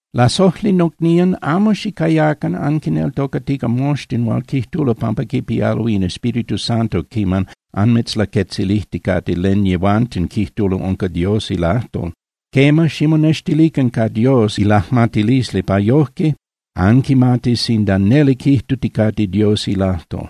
Lasojli nocnían, amo xicayacan anquineltocatica moxtin hual quijtulo pampa quipialo in Espíritu Santo quiman anmitzlaquetzilijticate len yehuanten quijtulo unca Dios ilajtol. Quema, ximonextilican ca Dios ilajmatilisli pa yojque anquimatis sinda neli quijtuticate Dios ilajtol.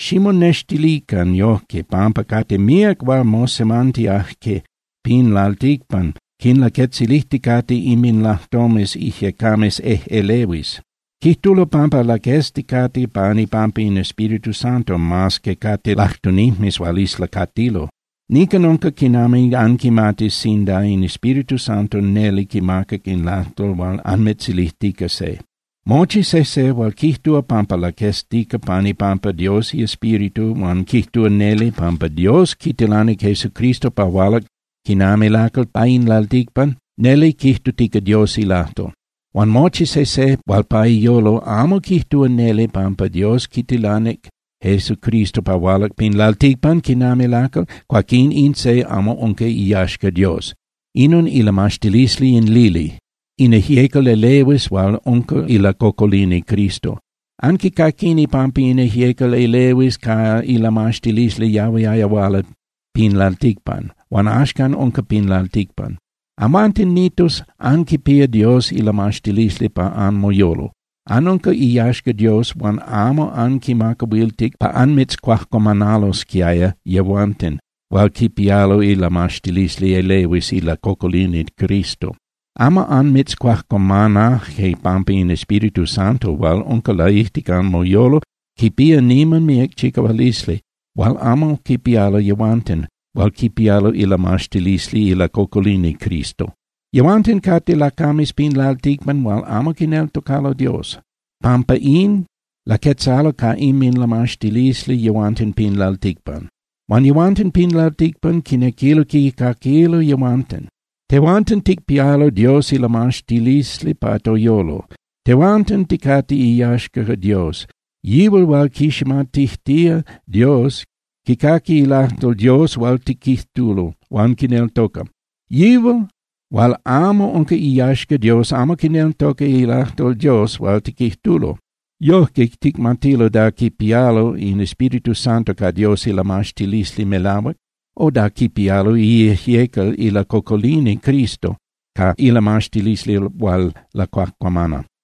Ximonextilican yojque, pampa cate míac hual mosemantiaje pin lalticpan, quinlaquetzilijticate inminlajtomes ijyecames ejꞌelehuis. Quijtulo pampa laquezticate pan ipampa in Espíritu Santo mas que cate lajtunijmes hual islacatilo. Nican unca quinami anquimatis sinda in Espíritu Santo neli quimacac in lajtol hual anmitzilijtica se: Mochi sejse hual quijtúa pampa laqueztica pan ipampa Dios iEspíritu huan quijtúa neli pampa Dios quitilanic Jesucristo pa hualac quinami lacal pa in lalticpan, neli quijtutica Dios ilajtol. Huan mochi sejse hual pa iyolo amo quijtúa neli pampa Dios quitilanic Jesucristo pa hualac pin lalticpan quinami lacal, cuaquín in se amo unca iyaxca Dios. Inon ilamaxtilisli in lili, in ijyecal elehuis hual unca ilacocolini Cristo. Anquicaquini pampa in ijyecal elehuis ca ilamaxtilisli yahuiaya huala pin lalticpan, huan axcan unca pin lalticpan. Amhuanten, Nitos, anquipía Dios ilamaxtilisli pa anmoyolo. Anunca iyaxca Dios huan amo anquimacahuiltic pa anmitzcuajcuamanalosquiaya yehuanten hual quipialo ilamaxtilisli elehuis ilacocolini Cristo. Amo anmitzcuajcuamanaje pampa in Espíritu Santo hual unca laijtic anmoyolo quipía niman míac chicahualisli hual amo quipialo yehuanten hual quipialo ilamaxtilisli ilacocolini Cristo. Yehuanten cate lacames pin lalticpan hual amo quineltocalo Dios. Pampa in, laquetzalo ca inminlamaxtilisli yehuanten pin lalticpan. Huan yehuanten pin lalticpan quinequilo quicaquilo yehuanten. Tehuanten ticpialo Dios ilamaxtilisli pa toyolo, tehuanten ticate iyaxca Dios. Yihual hual quiximatijtía Dios quicaqui ilajtol Dios hual tiquijtulo, huan quineltoca. Yihual hual amo unca iyaxca Dios amo quineltoca ilajtol Dios hual tiquijtulo. Yojque ticmatilo da quipialo in Espíritu Santo ca Dios ilamaxtilisli melahuac, o da quipialo iijyecal ilacocolini Cristo ca ilamaxtilisli hual lacuajcuamana.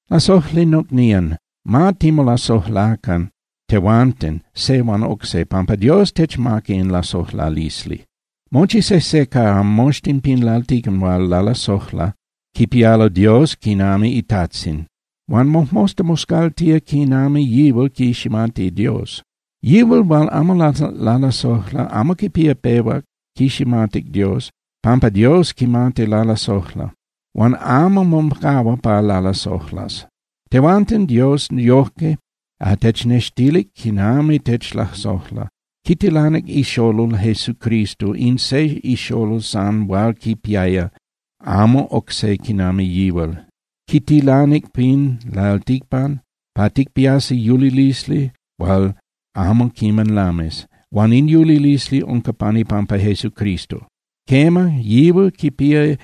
Lasojli nocnían, ma timolasojlacan tehuanten se huan oc se, pampa Dios techmaca in lasojlalisli. Mochi sejse ca moxtin pin lalticpan hual lalasojla quipía Dios quinami iTajtzin huan mojmosta moscaltía quinami yihual quiximati Dios. Yihual hual amo lalasojla amo quiman pehuac quiximatic Dios, pampa Dios quimati lalasojla, huan amo mocahua pa lalasojlas. Tehuanten Dios yojque technextilic quinami techlasojla: Quitilanic iXolol Jesucristo, in se ixolol san hual quipiaya, amo oc se quinami yihual. Quitilanic pin lalticpan pa ticpiasi yulilisli hual amo quiman lamis huan in yulilisli unca pan ipampa Jesucristo. Quema, yihual quipía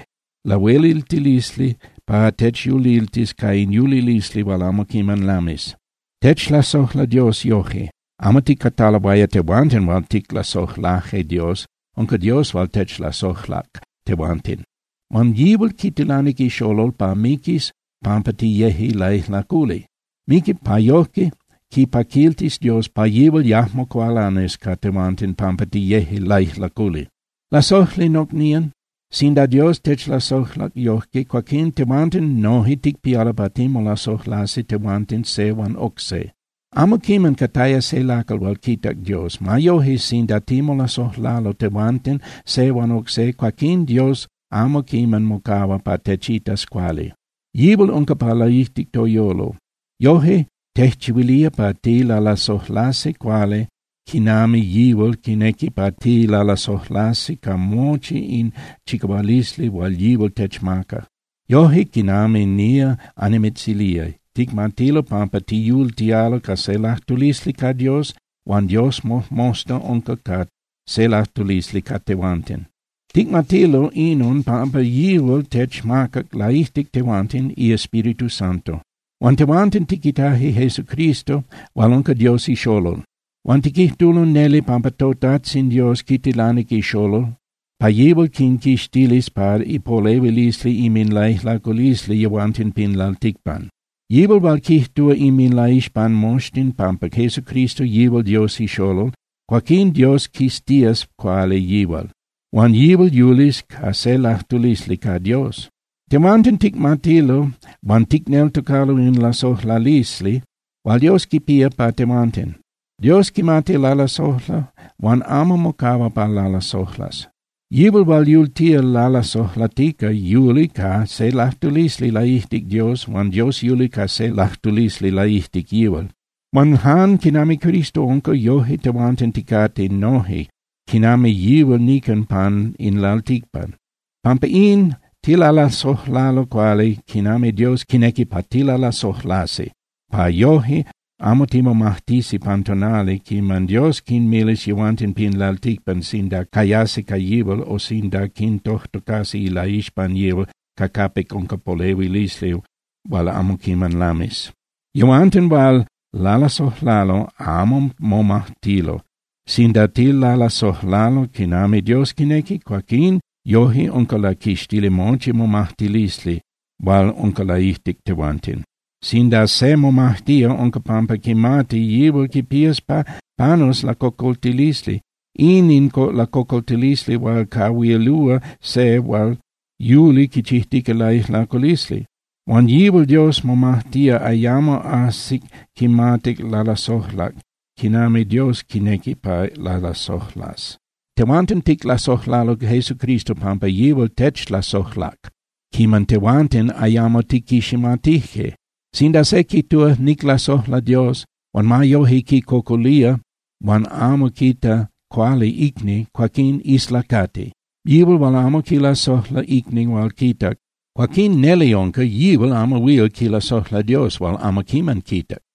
lahueliltilisli pa techyuliltis ca in yulilisli hual amo quiman lamis. Techlasojla Dios yoje: Amo ticataloaya tehuanten hual ticlasojlaje Dios. Unca Dios hual techlasojlac tehuanten. Huan yihual quitilanic iXolol pa miquis pampa tiyeje laijlaculi. Miquic pa yoje quipaquiltis Dios pa yihual yajmo cualanis ca tehuanten pampa tiyeje laijlaculi. Lasojli nocnían, sinda Dios techlasojlac yojque, cuaquín tehuanten noje ticpialo pa timolasojlasi tehuanten se huan oc se. Amo quiman cataya se lacal hual quitac Dios. Ma yoje, sinda timolasojlalo tehuanten se huan oc se, cuaquín Dios amo quiman mocahua pa techitas cuali. Yihual unca pa laijtic toyolo. Yoje tejchihuilía pa tilalasojlasi cuali quinami yihual quinequi pa tilalasojlasi ca mochi in chicahualisli hual yihual techmaca. Yoje quinami nía annimitzilía, ticmatilo pampa tiyultialo ca se lajtulisli ca Dios huan Dios mojmosta unca ca se lajtulisli ca tehuanten. Ticmatilo inon pampa yihual techmacac laijtic tehuanten iEspíritu Santo. Huan tehuanten tiquitaje Jesucristo hual unca Dios iXolol. Huan tiquijtulo neli pampa toTajtzin Dios quitilanic iXolol pa yihual quinquixtilis pa ipolehuilisli inminlaijlaculisli yehuanten pin lalticpan. Yihual hual quijtúa inminlaixpan moxtin pampa Jesucristo yihual Dios iXolol, cuaquín Dios quiztías cuali yihual, huan yihual yulis ca se lajtulisli ca Dios. Tehuanten ticmatilo huan ticneltocalo in lasojlalisli hual Dios quipía pa tehuanten. Dios quimati lalasojla huan amo mocahua pa lalasojlas. Yihual hual yultía lalasojlatica yuli ca se lajtulisli laijtic Dios huan Dios yuli ca se lajtulisli laijtic yihual. Huan jan quinami Cristo unca, yojque tehuanten ticate noje quinami yihual nican pan in lalticpan. Pampa in, tilalasojlalo cuali quinami Dios quinequi pa tilalasojlasi, pa yojque amo timomajtisi pan tonali quiman Dios quinmilis yehuanten pin lalticpan sinda cayasi ca yihual o sinda quintojtocas ilaixpan yihual ca capic unca polehuilisli hual amo quiman lamis. Yehuanten hual lalasojlalo amo momajtilo. Sinda tilalasojlalo quinami Dios quinequi, cuaquín yojque unca laquixtili mochi momajtilisli hual unca laijtic tehuanten. Sinda se momajtía, unca pampa quimati yihual quipías pa panus lacocoltilisli. In in lacocoltilisli hual cahuilúa se hual yuli quichijtica laijlaculisli. Huan yihual hual momajtía ayamo ajsic quimatic lalasojlac quinami Dios quinequi pa lalasojlas. Tehuanten ticlasojlalo Jesucristo pampa yihual techlasojlac quiman tehuanten ayamo tiquiximatije. Sinda se quijtúa: “Niclasojla Dios”, huan ma yoje quicocolía huan amo quita cuali icni, cuaquín islacati. Yihual hual amo quilasojla icni hual quitac, cuaquín neli unca yihual amo huil quilasojla Dios hual amo quiman quitac.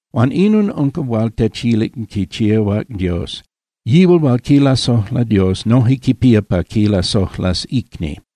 Huan inon unca hual techilic chicahuac Dios: Yihual hual quilasojla Dios noje quipía pa quilasojlas icni.